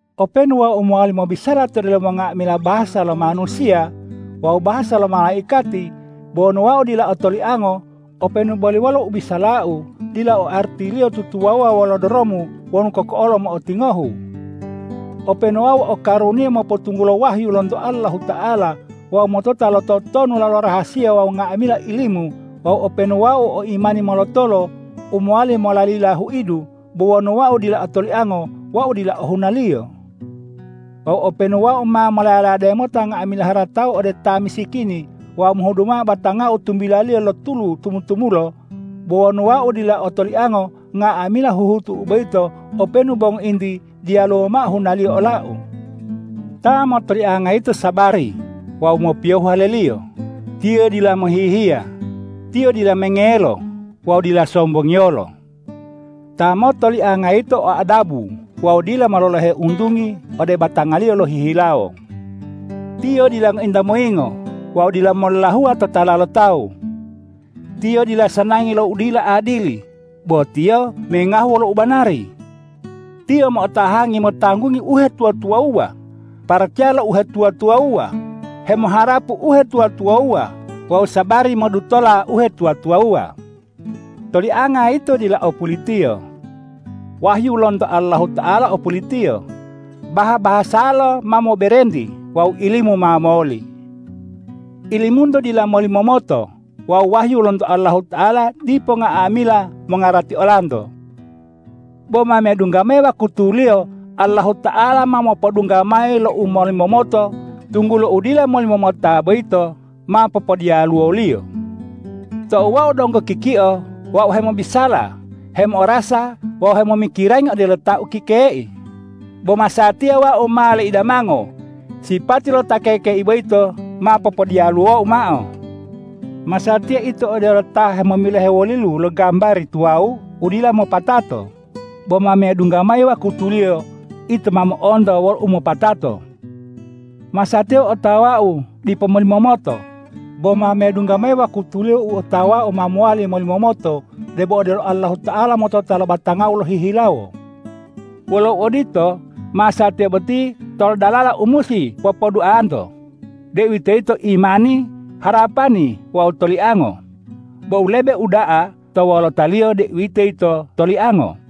Openu wau mowali mobisala to delomo nga'amila bahasa lo manusiya wawu bahasa lo malaikati, bo wonu wau dila o toliango, openu boli wolo u bisalau dila o artiliyo tutuwawuwa wolo doromu wonu koko'olo mo'otingohu. Openu wau o karuniya mopotunggulo wahyu lonto Allahuta'ala wawu motota lo totonulala rahasiya wawu nga'amila ilimu wawu openu wau o imani molotolo u mowali molalila huidu, bo wonu wau dila o toliango, wau dila ohunaliyo. Wawu openu wau ma molaya-layade mota nga'amila haratau ode ta misikini wawu mohudu mao batangau tumbilaliyo lo tulu tumu-tumulo, bo wonu wau dila o toliango, nga'amila huhutu'u boyito openu bo ngointi diyaluwo mao hunaliyo olau. Ta motolianga yito sabari wawu mopiyohu haleliyo, tiyo dila mohihiya, tiyo dila mengelo wawu dila sombongiyolo. Ta motolianga yito o adabu wawu dila mololohe untungi ode batangaliyo lohihilawo. Tiyo dila ngointa moyingo wawu dila mollahuwa totala lo tawu. Tiyo dila sanangi lo u dila adili, bo tiyo mengahu wolo u banari. Tiyo mo'otahangi motanggungi uhetuwa-tuwawuwa, paracaya lo uhetuwa-tuwawuwa, hemoharapu uhetuwa-tuwawuwa wawu sabari modutola uhetuwa-tuwawuwa. Tolianga yito dila o pulitiyo. Wahyu lonto Allahuta'ala o pulitiyo, baha-bahasalo ma moberenti wawu ilimu ma moli. Ilimunto dila molimomoto wawu wahyu lonto Allahuta'ala dipo nga'amila mongarati olanto. Bo ma medungga mayi wakutuliyo Allahuta'ala ma mopodungga mayi lo u molimomoto, tunggulo u dila molimomota boyito ma popodiyaluwo-Liyo. Tou wau donggo kikio wau hemobisala, hemo'orasa wawu hemomikirangi odelo ta ukekei. Bo masatiya wau ma laidamango; sipati lo ta kekei boyito ma popodiyaluwou mao. Masatiya ito odelo ta hemomilohe wolilu lo gambari tuwawu u dila mopatato; bo ma medungga mayi wakutuliyo ito ma mo'onto wolo umopatato. Masatiya u otawau dipo molimomoto; bo ma medungga mayi wakutuliyo u otawau ma mowali molimomoto debo odelo Allahuta'ala motota lo batangau lohihilawo. Wolo uodito, masatiya boti tolo dalala u musi popouda'anto, deuwitoyito imani, harapani wawu toliango. Bo u lebe uda'a to wolotaliyo, deuwitoyito toliango.